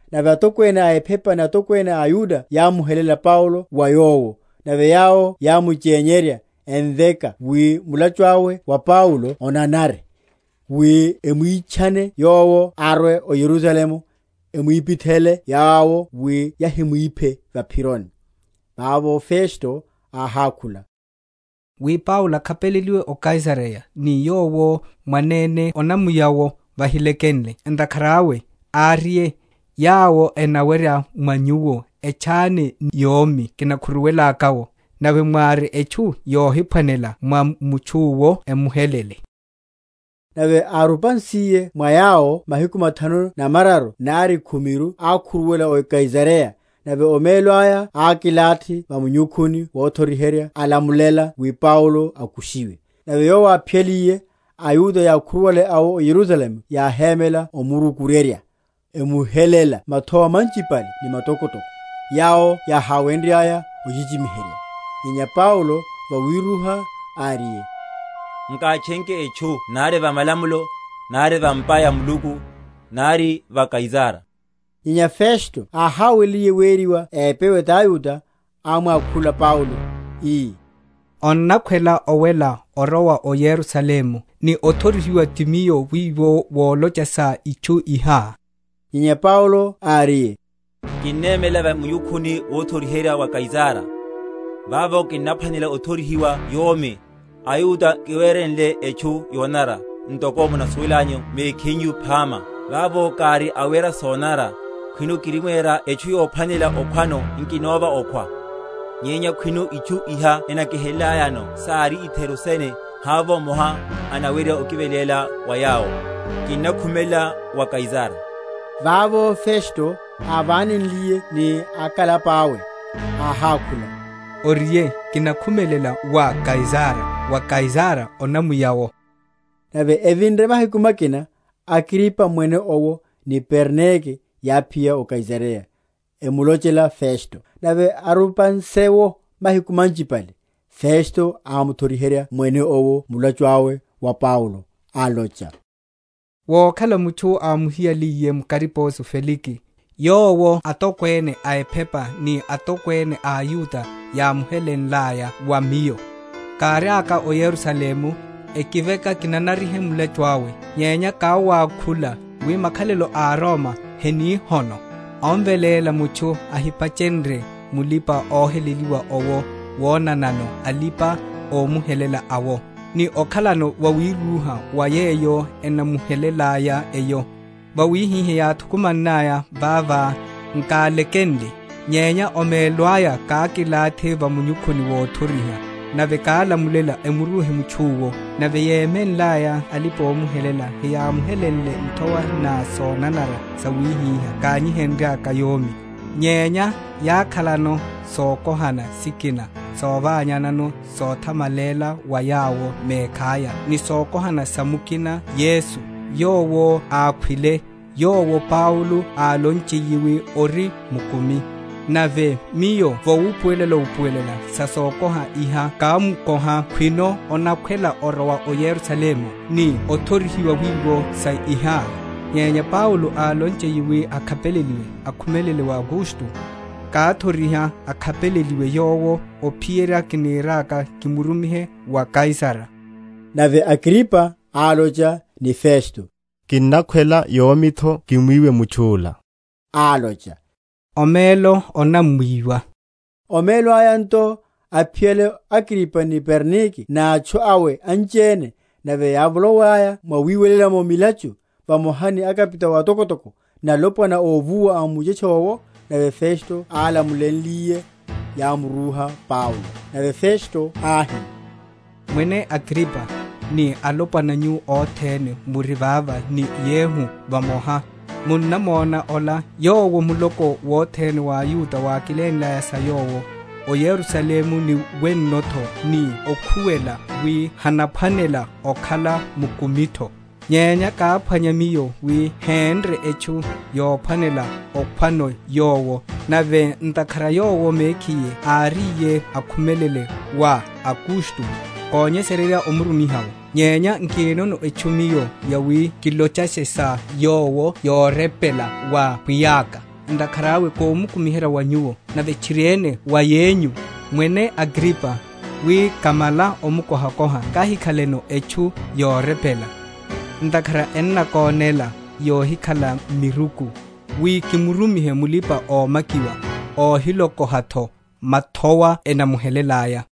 Nave atokwene a ephepa ni atokwene a aYuda yámuhelela Paulo wa yowo; nave yawo yámuchenyerya, emveka wi mulachu awe wa Paulo onanare, wi emwitchane yowo arwe o Yerusalemu; emwipithele yawo wi yahimwiphe va’phironi. Vavo Festo áhákhula, wi Paulo akhapeleliwe o Kaisareya, ni yowo mwanene onamuya’wo vahilekenle. Ntakhara awe, áriye, yawo enawerya mwa nyuwo etchane ni yomi kinakhuruwelaka’wo, nave wári etchu yohiphwanela mwa mutchu’wo emuhelele. Nave árupansiye mwa yawo mahiku mathanu na mararu nari khumiru ákhuruwela o Kaisareya; nave omelo aya ákilathi va munyukhuni wothoriherya alamulela wi Paulo akushiwe. Nave yowo áphiyaliye, aYuda yákhuruwale awo o Yerusalemu yáhémela omurukuryerya, emuhelela mathowa manchipale ni matokotoko, yawo yaháwenryaya ochichimiherya; nyenya Paulo vawirúha áriye, Nkátchenke etchu nari va malamulo, nari va’mpa ya Muluku, nari va Kaisara. Nyenya Festo áháweliye weriwa épewe taYuda, ámwakhula Paulo, ii, Onnakhwela owela orowa o Yerusalemu, ni othorihiwa ti miyo wiwo volocha sa itchu iha? Nyenya Paulo áriye, Kinnemela va munyukhuni wothoriherya wa Kaisara, vavo kinnaphwanela othorihiwa yomi; aYuda nkiwerenle etchu yonanara, ntoko munasuwelela nyu mekhinyu phama. Vavo kári awera sonanara, khwino kirimwera etchu yophwanela okhwano nkinova okhwa; nyenya khwino itchu iha enakihelelayano sári itheru sene havovo mmoha anawerya okiveléla wa yawo. Kinnakhumelela wa Kaisara. Vavo Festo, ávanenliye ni akalapa’we, áhákhula, Oriye, Kinakhumelela wa Kaisara; wa Kaisara onamuya’wo. Nave evinre mahiku makina, Agripa Mwene owo, ni Bernike yáphiya o Kaisareya, emulochela Festo. Nave arupanse’wo mahiku manchipale, Festo ámuthoriherya Mwene owo mulachu awe wa Paulo, alocha, Vokhala mutchu ámuhiyaliye mu kariposo Felike, yowo atokwene a ephepa ni atokwene a aYuda yámuhelenlaya wa miyo, káriaka o Yerusalemu, ekiveka kinana?-?rihe mulachu awe. Nyenya káwakhula, wi makhalelo a aRoma heni hono, omveléla mutchu ahipachenrye mulipa‐oheleliwa owo wonanano alipa‐omuhelela awo, ni okhalano vawirúha va yeyo enamuhelelay’eyo. Vawihihá, yáthukumannaya vava, nkalekenle, nyenya omelo aya kákilathi va munyukhuni wothoriherya, nave kálamulela emuruhe mutchu’wo. Nave yémenlaya alipa‐omuhelela heyámuhelenleru nthowa na sonanara sawihiha kányiheryelaka yomi: nyenya yákhalano sokohana sikina sovanyanano sothamalela wa yawo mekhaya, ni sokohana sa mukina Yesu, yowo ákhwile, yowo Paulo álochiye wi ori mukumi. Nave miyo vawupuwelela‐upuwelela sa sokohana iha kámukoha khwino anakhwela orowa o Yerusalemu, ni othorihiwa wiwo sa iha. Nyenya Paulo álonchiye wi akhapeleliwe, akhumelele wa Augusto, káthoriha akhapeleliwe yowo ophiyerya kiniriaka kimurumihe wa Kaisara. Nave Agripa álocha ni Festo, Kinnakhwela yomi’tho kimwiwe mutchu’la. Álocha, Omelo, onamwiwa. Omelo aya nto, aphiyale Agripa ni Bernike n’atchu awe anchiene, nave yávoloiyaya mwawiwela’mo milachu, vamoha ni akapitao atokotoko, ni alopwana óvuwa a muchetche owo, nave Festo álamulenliye, yamurúha Paulo. Nave Festo áhi, Mwene Agripa, ni alopwana nyu othene muri vava ni yehu vamoha, munnamona ola, yowo muloko wothene wa aYuda wákilénlaya sa yowo, o Yerusalemu ni wenno’tho, ni okhuwela, wi hanaphwanela okhala mukumi’tho. Nyenya káphwanya miyo wi hénre etchu yophwanela okhwano yowo; nave ntakhara yowo mekhiye áriye akhumelele wa Augusto, konyesererya omurumiha’wo. Nyenya nkinono etchu miyo yawi kilochashe sa yowo yorepela wa pwiya’ka. Ntakhara awe komukumiherya wa nyuwo, nave tchiriene wa yenyu, Mwene Agripa, wi, kamala omukohakoha, kahikhaleno etchu yorepela. Ntakhara ennakonéla yohikhala miruku, wi kimurumihe mulipa‐omakiwa, óhilokoha’tho mathowa enamuhelelaya.